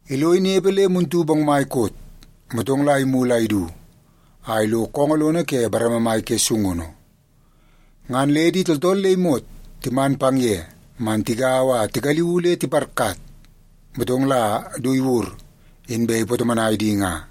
Ilo inepe le muntu bongmai koot, motong la imulu a idu a ilo koongoo lono ke bareme mai ke sungunu. Ngan le di tooltool le imot timan pang ye man tigaua a tigaliuu le tiparkat, motong la du iwur, inbe ipatomonai di nga.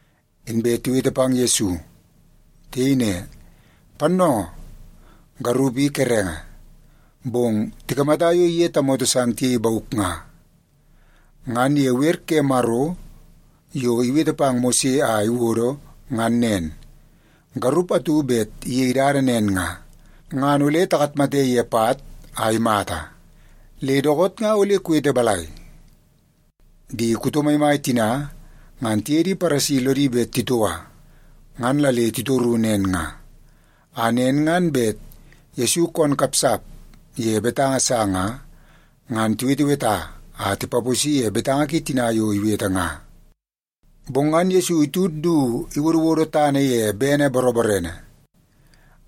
inbe tiwete pang Yesu. Tiyei ne, “Pannoongoo, garup i kerenge, bong tikamata yo iye tamoto san tiyei bauk nga. Ngan ye wer ke Maro yo iwete pang Mose a iwodo ngan nen, garup atu bet iyei dada nen nga, ngan ole takatmate ye pat a imata. Le dookoot nga ole kuwete balai?” Di kuto maimai tina ngan tiye di Paresi lodi bet titoua. Ngan la le titoru nen nga, a nen ngan bet Yesu koon kapsap ye betanga sa nga, ngan tiweteweta a tipaposi ye betanga ki tina yo iwete nga. Bong ngan Yesu itud du iwodowodo tana ye bene boroborene.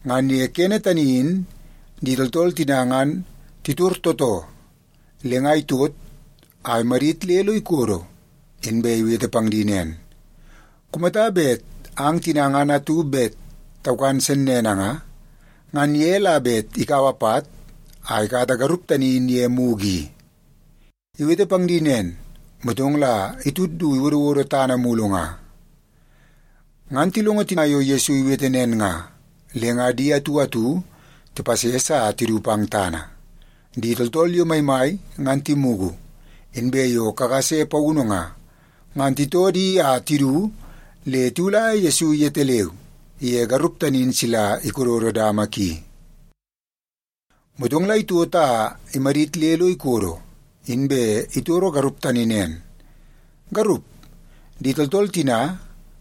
Ngan ye kene tani in di tooltool tina ngan titor tootoo, le nga itot a imadit le lo ikodo, inbe iwete pang di nen, “Kumata bet ang tina ngan atu bet taukan sennene nga, ngan ye la bet ikaua pat a ikata garup tani in ye mugu i.” Iwete pang di nen, motong la itud du iwodowodo tana mulu nga. Ngan tilongo tina yo Yesu iwete nen nga, le nga di atu atu tipases a tidu pang tana. Di tooltool yo maimai ngan timugu, inbe yo kakase paunu nga, ngan titoo di a tidu le tiwulaia Yesu yetaleu iye garup tani in sila ikododo dama ki. Motong la itot a imadit le lo ikodo, inbe itoro garup tani nen, “Garup, di tooltool tina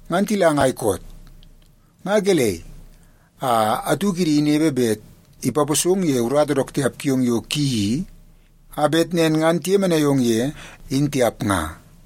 ngan tila ngai koot? Nga gelei a atu kidi inepe bet ipaposong ye urata dook tiap kiong yo kuyeii i, a bet nen ngan tiyemenai ong ye, in tiap nga?”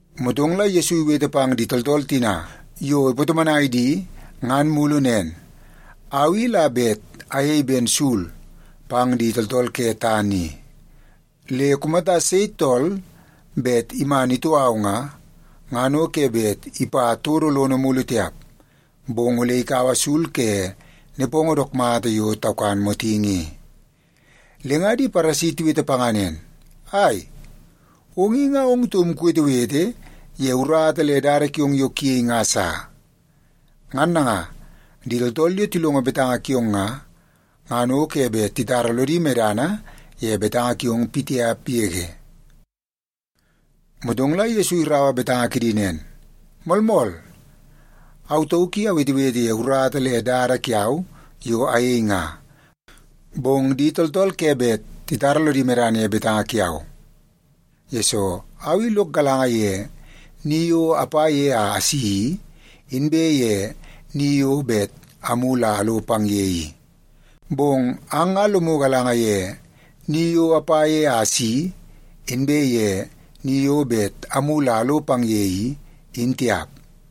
Motong la Yesu iwete pang di tooltool tina yo ipatomonai di ngan mulu nen, “Au i la bet ayei ben sul pang di tooltool ke tana i. Le kumata sei tool bet iman itoo au nga, ngan o ke bet ipa todo lono mulu tiap, bong ole ikaua sul ke nepongo dook mata yo taukan motingi i.” Le nga di Paresi tiwete panga nen, “Ai, ong i nga ong taum kuwetewete ye urata le dada kiong yo kuyei nga sa. Ngan nanga, di tooltool yo tilongo betanga kiong nga, ngan o ke bet titara lodi medana ye betanga kiong pitiap yege.” Motong la Yesu iraua betanga kidi nen, “Moolmool, au tauk i awetewete ye urata le dada kiau yo ayei nga, bong di tooltool ke bet titara lodi medana ye betanga kiau, yesoo au i lok galanga ye ni yo apa ye a asi i, inbe ye ni yo bet amulu a alo pang ye i. Bong ang nga lomu galanga ye ni yo apa ye a asi i, inbe ye ni yo bet amulu a alo pang ye i, in tiap.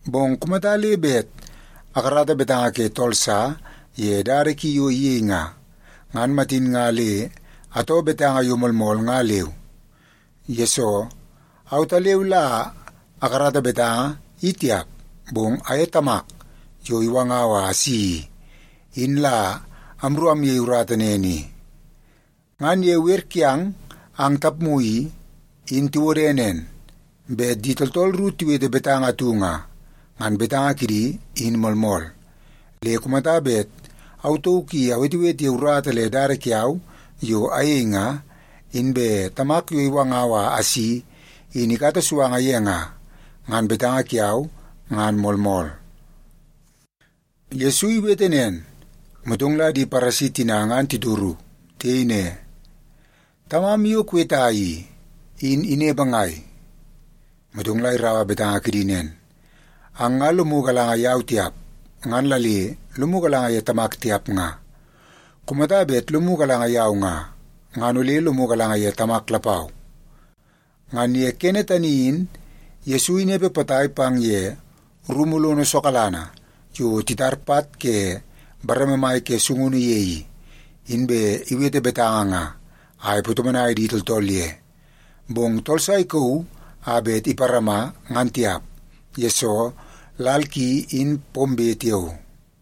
Bong kumata le bet akarata betanga ke tool sa ye dada ki yo iyei nga, ngan matin nga le atoo betanga yo moolmool nga leu. Yesoo, autaleu la akarata betanga, i tiap, bong aye Tamak yo iwangau a asi i, in la amru amyei urata nen i. Ngan ye wer kiang ang tapmu i, in tiwode nen, bet di tooltool ru tiwete betanga atu nga, ngan betanga kidi in moolmool. Le kumata bet au tauk i awetewete ye urata le dada kiau yo ayei nga, inbe Tamak yo iwangau a asi in ikata suanga ye nga, ngan betanga kiau ngan moolmool.” Yesu iwete nen, motong la di Paresi tina ngan titoru. Tiyei ne, “Tamam yo kuweta i, in inepe ngai?” Motong la iraua betanga kidi nen, “Ang nga lomu galanga yau tiap, ngan la le lomu galanga ye Tamak tiap nga. Kumata bet lomu galanga yau nga, ngan ole lomu galanga ye Tamak lapau.” Ngan ye kene tani in Yesu inepe potai pang ye rumu lono sokalanga yo titar pat ke bareme mai ke sungunu ye i, inbe iwete betanga nga a ipatomonai di tooltool ye. Bong tool sa ikauu a bet iparama ngan tiap, yesoo lal ki, in pombe tiao.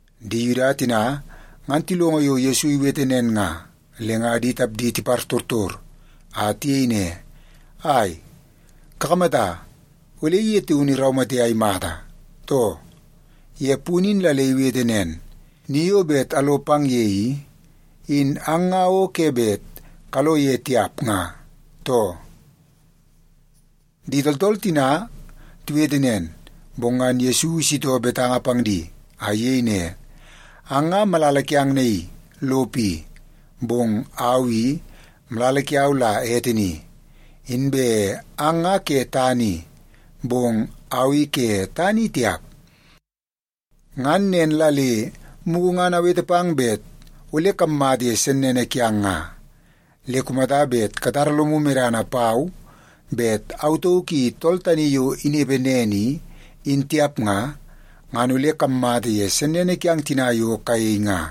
Di Yuda tina ngan tilongo yo Yesu iwete nen nga, le nga di tapdi tipartortor a tiyei ne, “Ai, kakamata ole ye taun iraumate a imata, too? Ye punu in la le iwete nen, ‘Ni yo bet alo pang ye i, in ang nga o ke bet kalo ye tiap’ nga, too.” Di tooltool tina tiwete nen, bong ngan Yesu isitoo betanga pang di a iyei ne, “Ang nga malala kiang naii lopo i, bong au i malala kiau la ete ni. Inbe ang nga ke tana i, bong au i ke tana i tiap. Ngan nen la le mugu ngan awete pang bet ole kammata ye sennene kiang nga. Le kumata bet katara lomu medana pau bet Au Tauk I Tool Tani Yo Inepe Nen I, in tiap nga, ngan ole kammata ye sennene kiang tina yo kayei nga.”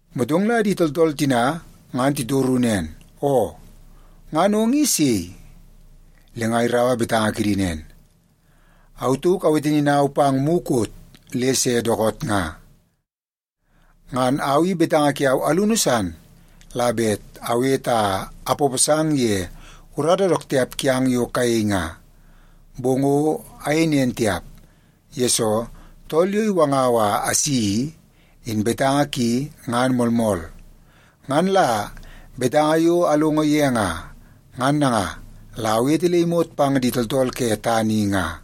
Motong la di tooltool tina ngan titoru nen, “Oo, ngan ong i sei?” Le nga iraua betanga kidi nen, “Au tauk awete ninau pang mukot le se dookoot nga. Ngan au i betanga kiau alunu san la bet awete a apaposang ye urata dook tiap kiang yo kayei nga. Bong o ayei nen tiap, yesoo Tool yo iwangau a asi i, in betanga ki ngan moolmool. Ngan la betanga yo alongo ye nga, ngan nanga la awete le imot pang di tooltool ke tana i nga.”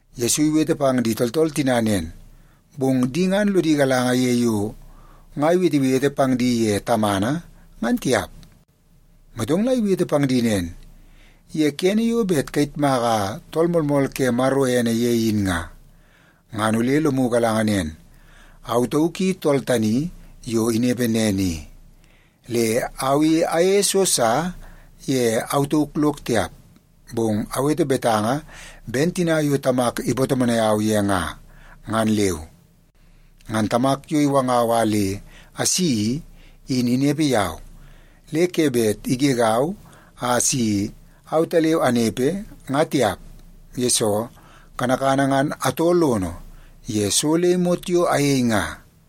Yesu iwete pang di tooltool tina nen, bong di ngan lodi galanga ye yo nga iwetewete pang di ye Tamana, ngan tiap. Motong la iwete pang di nen, “Ye kene yo bet kayitmaka Tool Moolmool ke Maro ene ye in nga, ngan ole lomu galanga nen, Au Tauk I Tool Tani Yo Inepe Nen I. Le au i ayeie so sa ye au tauk lok tiap, bong awete betanga ben tina yo Tamak ipatomonai au ye nga, ngan leu. Ngan Tamak yo iwangau a le asi i, in inepe yau. Le ke bet igegau a si autaleu anepe nga tiap, yesoo kanakana ngan atoo lono ye so le imot yo ayei nga.”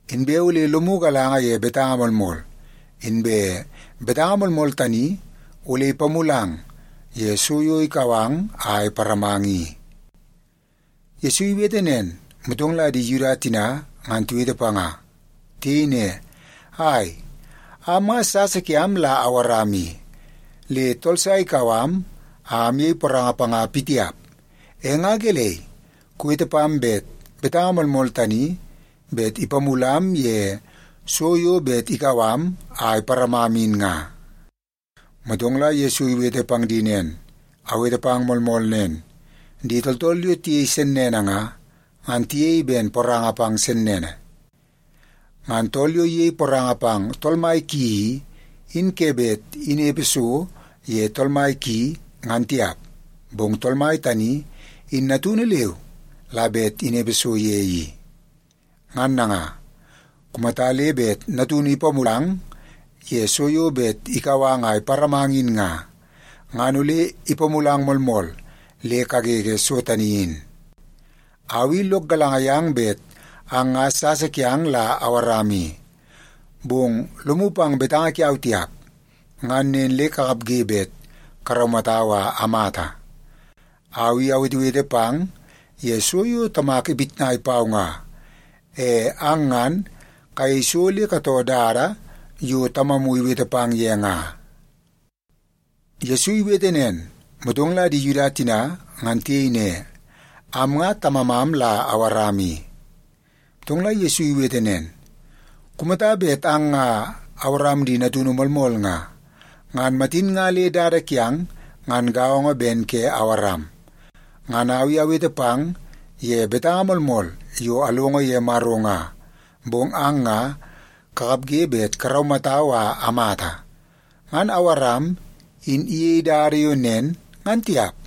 Inbe ole lomu galanga ye betanga moolmool, inbe betanga moolmool tani ole ipamulang ye so yo ikau ang a iparamang i.” Yesu iwete nen, motong la di Yuda tina ngan tiwete panga. Tiyei ne, “Ai, am nga sasa kiam la Awaram i, le tool sa ikau am a amyei poranga panga pitiap. E nga gelei kuwete pam bet betanga moolmool tani bet ipamulam ye so yo bet ikau am a iparamam in nga?” Motong la Yesu iwete pang di nen, “Awete pang moolmool nen, di tooltool yo tiyei sennene nga, ngan tiyei ben poranga pang sennene. Ngan tool yo iyei poranga pang tool mai ki i, in ke bet inepe so ye tool mai ki, ngan tiap, bong tool mai tani in natunu leu la bet inepe so ye i. Ngan nanga, kumata le bet Natunu ipamulang ye so yo bet ikau ang a iparamang in nga, ngan ole ipamulang moolmool le kagege so tani in. Au i lok galanga yang bet ang nga sasa kiang la Awaram i. Bong lomu pang betanga kiau tiap, ngan nen le kakapge bet karaumatau a amata. Au i awetewete pang ye so yo Tamak ipitnai pau nga. E ang ngan kayei so le katoo dada yo tamamu iwete pang ye nga.” Yesu iwete nen, motong la di Yuda tina ngan tiyei ne, “Am nga tamamam la Awaram i.” Motong la Yesu iwete nen, “Kumata bet ang nga Awaram di natunu moolmool nga, ngan matin nga le dada kiang ngan gaongo ben ke Awaram. Ngan au i awete pang ye betanga moolmool yo alongo ye Maro nga. Bong ang nga kakapge bet karaumatau a amata. Ngan Awaram in iyei dada yo nen, ngan tiap.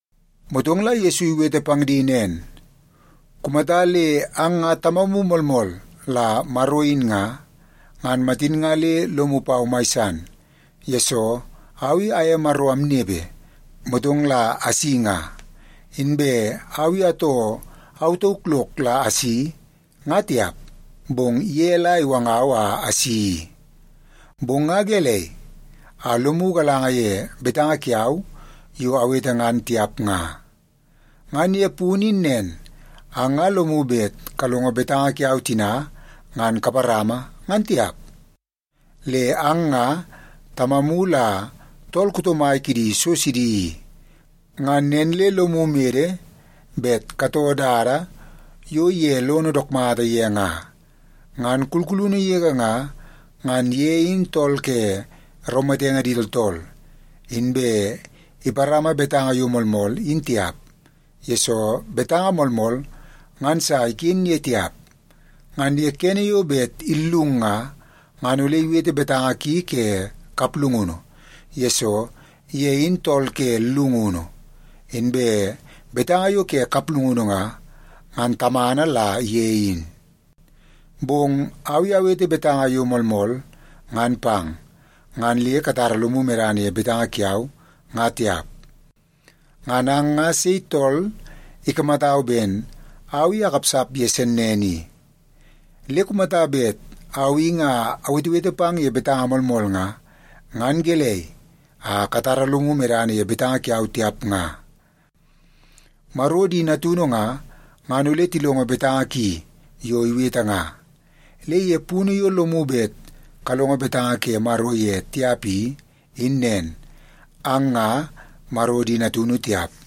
Motong la Yesu iwete pang di nen, “Kumata le ang nga Tamamu moolmool la Maro in nga, ngan matin nga le lomu pau mai san, yesoo au i aye Maro amnepe, motong la asi nga. Inbe au i atoo au tauk lok la asi, nga tiap, bong ye la iwangau a asi i. Bong nga gelei a lomu galanga ye betanga kiau yo awete ngan tiap nga? Ngan ye punu in nen, ang nga lomu bet kalongo betanga kiau tina ngan kaparama, ngan tiap. Le ang nga tamamu la tool kuto mai kidi so sidi i. Ngan nen le lomu mede bet katoo dada yo ye lon dook mata ye nga. Ngan kulkulunu yege nga, ngan ye in tool ke raumatenge di tooltool. Inbe iparama betanga yo moolmool in tiap, yesoo betanga moolmool ngan sa iken ye tiap. Ngan ye kene yo bet illung nga, ngan ole iwete betanga ki ke kaplungunu, yesoo ye in tool ke llungunu, inbe betanga yo ke kaplungunu nga, ngan tamana la ye in. Bong au i awete betanga yo moolmool ngan pang, ngan le katara lomu medana ye betanga kiau, nga tiap. Ngan ang nga sei tool ikamatau ben au i akapsap ye sennene i? Le kumata bet au i nga awetewete pang ye betanga moolmool nga, ngan gelei a katara lomu medana ye betanga kiau tiap nga? Maro di natunu nga, ngan ole tilongo betanga ki yo iwete nga. Le ye punu yo lomu bet kalongo betanga ke Maro ye tiap i, in nen, ang nga Maro di natunu tiap.”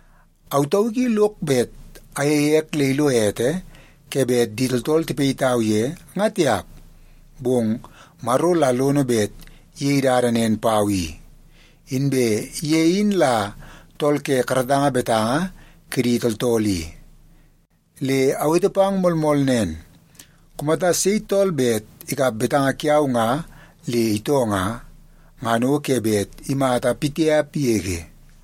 Au tauk i lok bet ayeie ek le ilo ete ke bet di tooltool tipayitau ye, nga tiap, bong Maro la lono bet iyei dada nen pau i. Inbe ye in la tool ke karatanga betanga kidi tooltool i. Le awete pang moolmool nen, kumata sei tool bet ikap betanga kiau nga le itoo nga, ngan o ke bet imata pitiap yege.”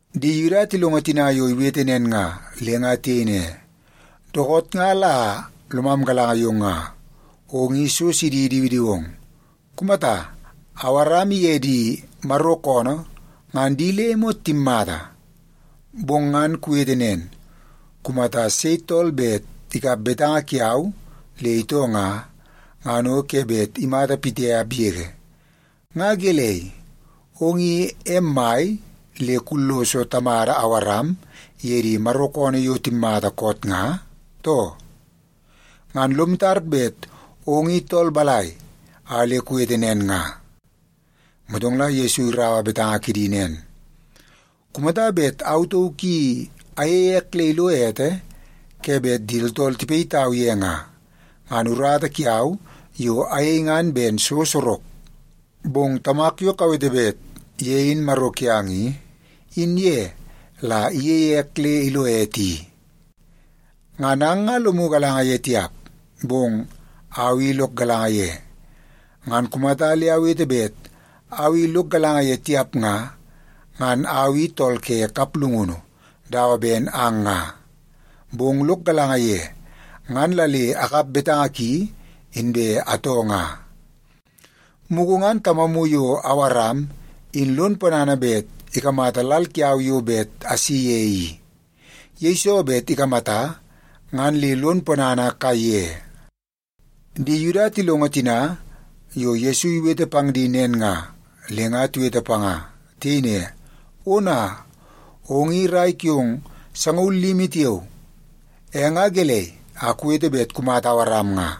Di Yuda tilongo tina yo iwete nen nga, le nga tiyei ne, “Dookoot nga la lomam galanga yong nga, ong i so sidi idiwidiwong. Kumata, Awaram iye di Maro koonoo ngan di le imot timmata. Bong ngan kuwete nen, ‘Kumata sei tool bet ikap betanga kiau le itoo nga, ngan o ke bet imata pitiap yege.’ Nga gelei, ong in em mai le kulloso tamada Awaram iye di Maro koonoo yo timmata koot nga, too? Ngan lom tar bet ong in tool balai a le kuwete nen nga?” Motong la Yesu iraua betanga kidi nen, “Kumata bet au tauk i ayeie ek le ilo ete ke bet di tooltool tipayitau ye nga, ngan urata kiau yo ayei ngan ben so sorok. Bong Tamak yo kawete bet ye in Maro kiang i, in ye la iyeie ek le ilo ete i. Ngan ang nga lomu galanga ye tiap, bong au i lok galanga ye. Ngan kumata le awete bet au i lok galanga ye tiap nga, ngan au i tool ke kaplungunu dawa ben ang nga. Bong lok galanga ye, ngan la le akap betanga ki inbe atoo nga. Mugu ngan tamamu yo Awaram in lon ponana bet ikamata lal kiau yo bet asi ye i. Yeiso bet ikamata, ngan le lon ponana kaiye.” Di Yuda tilongo tina yo Yesu iwete pang di nen nga, le nga tiwete panga. Tiyei ne, “Ona, ong i rai kiong sangaul limi tiao, e nga gelei a kuwete bet kumata Awaram nga?”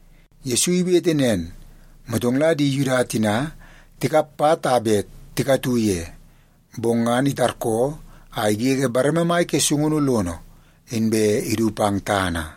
Yesu iwete nen, motong la di Yuda tina tikap pat a bet tikatu ye, bong ngan itarkoo a igege bareme mai ke sungunu lono inbe idu pang tana.